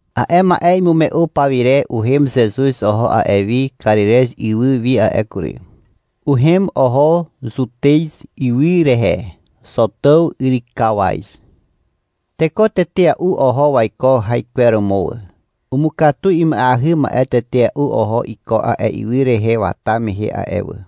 A'e ma'e imume'u pawire uhem Zezuz oho a'e wi Karirez ywy wi a'e kury. Uhem oho Zutez ywy rehe, Zotàw yrykawaz. Teko tetea'u oho waiko haikweromo wà. Umukatu ima'eahy ma'e tetea'u oho iko a'e ywy rehe wata mehe a'e wà.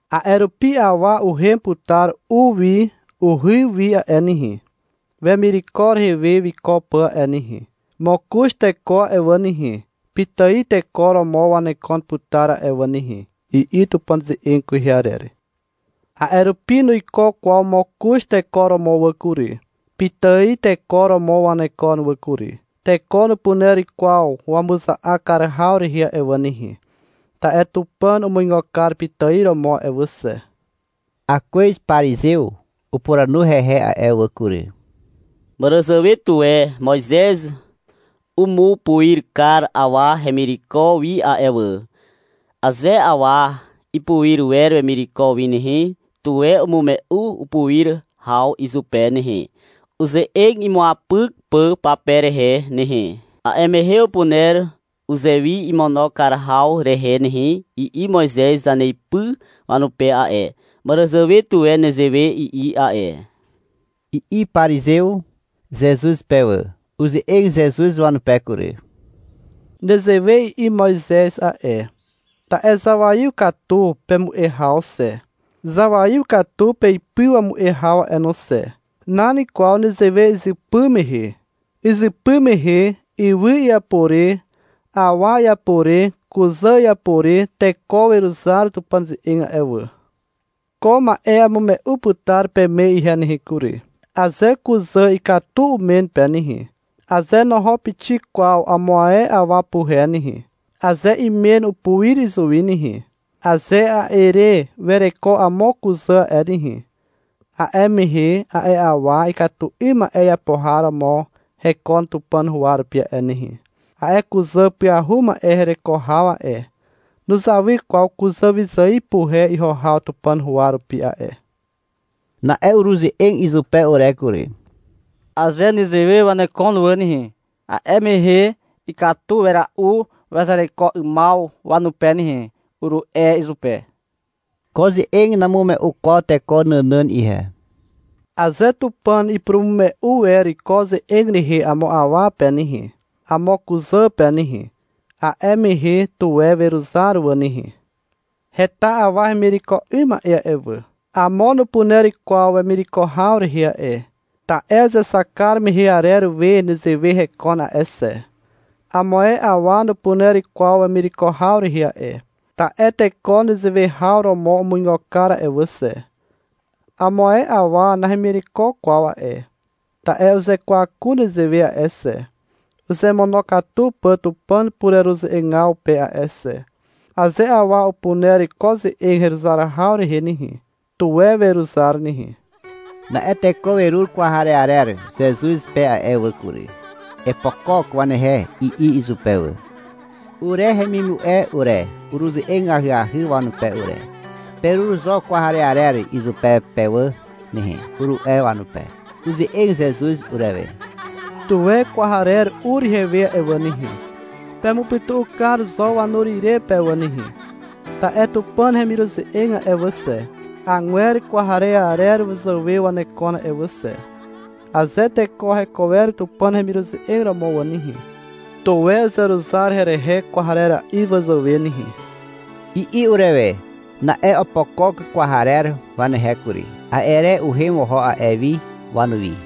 A'e rupi awa uhem putar u wi uhy wi a'e nehe, wemireko rehe we wiko pà a'e nehe. Mokoz teko a'e wà nehe, pitài teko romo wanekon putar a'e wà nehe, i'i Tupàn ze'eg kwehe arer. A'e rupi nuiko kwaw mokoz teko romo wà kury. Pitài teko romo wanekon wà kury. Teko nupuner kwaw wamuza'ak kar haw rehe a'e wà nehe, ta'e Tupàn umuigo kar pitài romo a'e wà xe. Akwez parizew upuranu hehe a'e wà kury. — Màràzàwe tuwe Moizez umupuir kar awa hemireko wi a'e wà. — Aze awa ipuir wer wemireko wi nehe, tuwe umume'u upuir haw izupe nehe, uze'eg imuapyk pà pape rehe nehe. A'e mehe upuner uzewi imono kar haw rehe nehe, i'i Moizez zaneipy wanupe a'e. Màràzàwe tuwe nezewe i'i a'e, i'i parizew Zezuz pe wà. Uze'eg Zezuz wanupe kury. — Nezewe i'i Moizez a'e, ta'e zawaiw katu pemu'e haw xe, zawaiw katu peipy wamu'e haw a'e wà no xe. Nan kwaw nezewe izypy mehe. Izypy mehe ywy iapo re awa iapo re kuzà iapo re teko weruzar Tupàn ze'eg a'e wà. Ko ma'e amume'u putar peme ihe nehe kury. Aze kuzà ikatu umen pe nehe, aze noho pixik kwaw amo ae awa puhe nehe, aze imen upuir izuwi nehe, aze a'e re wereko amo kuzà a'e nehe, a'e mehe a'e awa ikatu 'ym ma'e iapo har romo hekon Tupàn huwa rupi a'e nehe. A'e kuzà pyahu ma'e hereko haw a'e, nuzawy kwaw kuzà wyzài puhe iho haw Tupàn huwa rupi a'e. Na'e uruze'eg izupe ure kury. — Aze nezewe wanekon wà nehe, a'e mehe ikatu wera'u wazereko 'ymaw wanupe nehe, uru'e izupe. — Ko ze'eg namume'u kwaw teko nànàn ihe. Aze Tupàn ipurumume'u wer ko ze'eg rehe amo awa pe nehe, amo kuzà pe nehe, a'e mehe, tuwe weruzar wà nehe. Heta awa hemireko 'ym ma'e a'e wà. Amo nupuner kwaw wemireko haw rehe a'e, ta'e uzexak kar mehe arer we nezewe hekon a'e xe. Amo ae awa nupuner kwaw wemireko haw rehe a'e, ta'e teko nezewe haw romo umuigo kar a'e wà xe. Amo ae awa nahemireko kwaw a'e, ta'e uzekwaku nezewe a'e xe, uzemonokatu pà Tupàn pureruze'egaw pe a'e xe. Aze awa upuner ko ze'eg heruzar haw rehe nehe, tuwe weruzar nehe. Na'e teko werur kwarearer Zezuz pe a'e wà kury. — Epokok wanehe, i'i izupe wà. Ure hemimu'e ure, uruze'eg ahyahy wanupe ure. — Perur zo kwarearer izupe pe wà nehe, uru'e wanupe. Uze'eg Zezuz urewe. — Tuwe kwarer ur ihewe a'e wà nehe. Pemupytu'u kar zo wanur ire pe wà nehe. Ta'e Tupàn hemiruze'eg a'e wà xe, agwer kwarearer wazàwe wanekon a'e wà xe. (Aze teko heko wer Tupàn hemiruze'eg romo wà nehe, tuwe uzeruzar herehe kwarera'i wazàwe nehe), i'i urewe. Na'e opokok kwarer wanehe kury. A'e re uhem oho a'e wi wanuwi.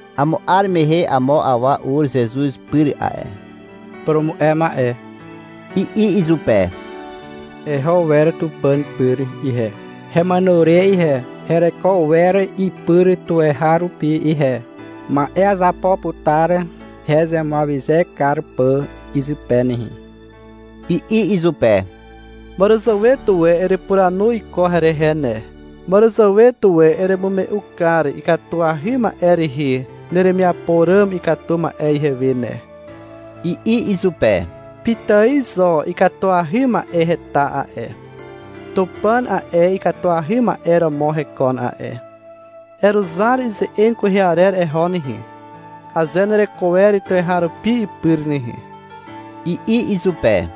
Amo 'ar mehe amo awa ur Zezuz pyr a'e. — Purumu'e ma'e, i'i izupe. — Heho wer Tupàn pyr ihe, hemàno re ihe. Hereko wer ipyr tuweharupi ihe. Ma'e azapo putar hezemuawyze kar pà izupe nehe, i'i izupe. — Màràzàwe tuwe erepuranu iko herehe ne, Màràzàwe tuwe eremume'u kar ikatuahy ma'e rehe neremiapo ràm ikatu ma'e ihewe ne, i'i izupe. — Pitài zo ikatuahy ma'e heta a'e. Tupàn a'e ikatuahy ma'e romo hekon a'e. Eruzar ize'eg kwehe arer eho nehe, aze nereko wer tuweharupi ipyr nehe, i'i izupe.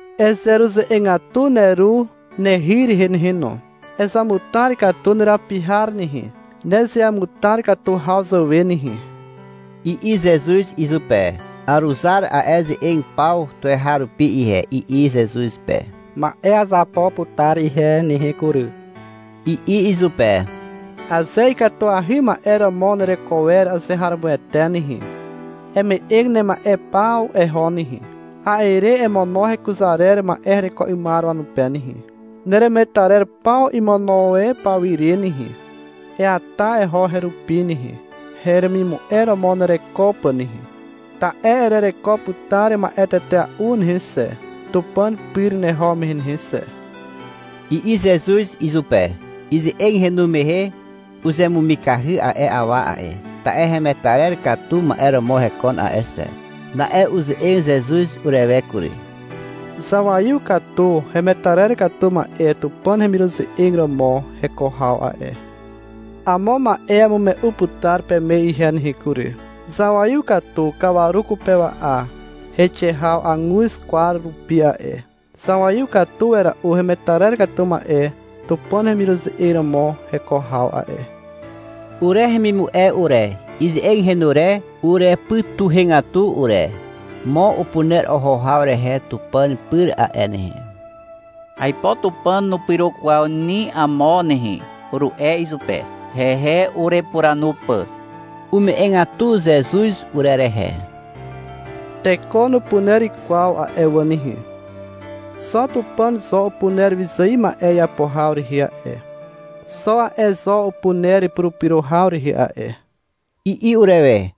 Ezeruze'egatu neru, nehy rehe nehe no. Ezamutar katu nerapi har nehe, nezeamutar katu haw zàwe nehe, i'i Zezuz izupe. — Aruzar a'e ze'eg paw tuweharupi ihe, i'i Zezuz pe. — Ma'e azapo putar ihe nehe kury, i'i izupe. — Aze ikatuahy ma'e romo nereko wer azeharomoete nehe, eme'eg nema'e paw eho nehe, a'e re emono hekuzar arer ma'e hereko 'ymar wanupe nehe. Neremetarer paw imono e pawire nehe, eata eho herupi nehe (heremimu'e romo nereko pà nehe). Ta'e erereko putar ma'e tetea'u nehe xe, Tupàn pyr neho mehe nehe xe, i'i Zezuz izupe. Ize'eg henu mehe uzemumikahy a'e awa a'e, ta'e hemetarer katu ma'e romo hekon a'e xe. Na'e uze'eg Zezuz urewe kury. — Zawaiw katu hemetarer katu ma'e Tupàn hemiruze'eg romo heko haw a'e. Amo ma'e amume'u putar peme ihe nehe kury. Zawaiw katu kawaru kupewa'a heixe haw aguz kwar rupi a'e. Zawaiw katu wera'u hemetarer katu ma'e Tupàn hemiruze'eg romo heko haw a'e. Ure hemimu'e ure, ize'eg henu re urepytuhegatu ure. — Mo upuner oho haw rehe Tupàn pyr a'e nehe. Aipo Tupàn nupyro kwaw ni amo nehe, uru'e izupe, hehe urepuranu pà. Ume'egatu Zezuz urerehe. — Teko nupuner kwaw a'e wà nehe. Xo Tupàn zo upuner wyzài ma'e iapo haw rehe a'e. Xo a'e zo upuner purupyro haw rehe a'e, i'i urewe.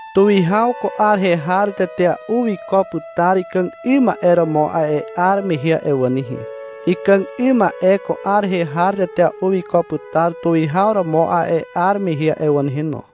Tuwihaw ko 'ar rehe har tetea'u wiko putar ikàg 'ym ma'e romo a'e 'ar mehe a'e wà nehe. Ikàg 'ym ma'e ko 'ar rehe har tetea'u wiko putar tuwihaw romo a'e 'ar mehe a'e wà nehe no.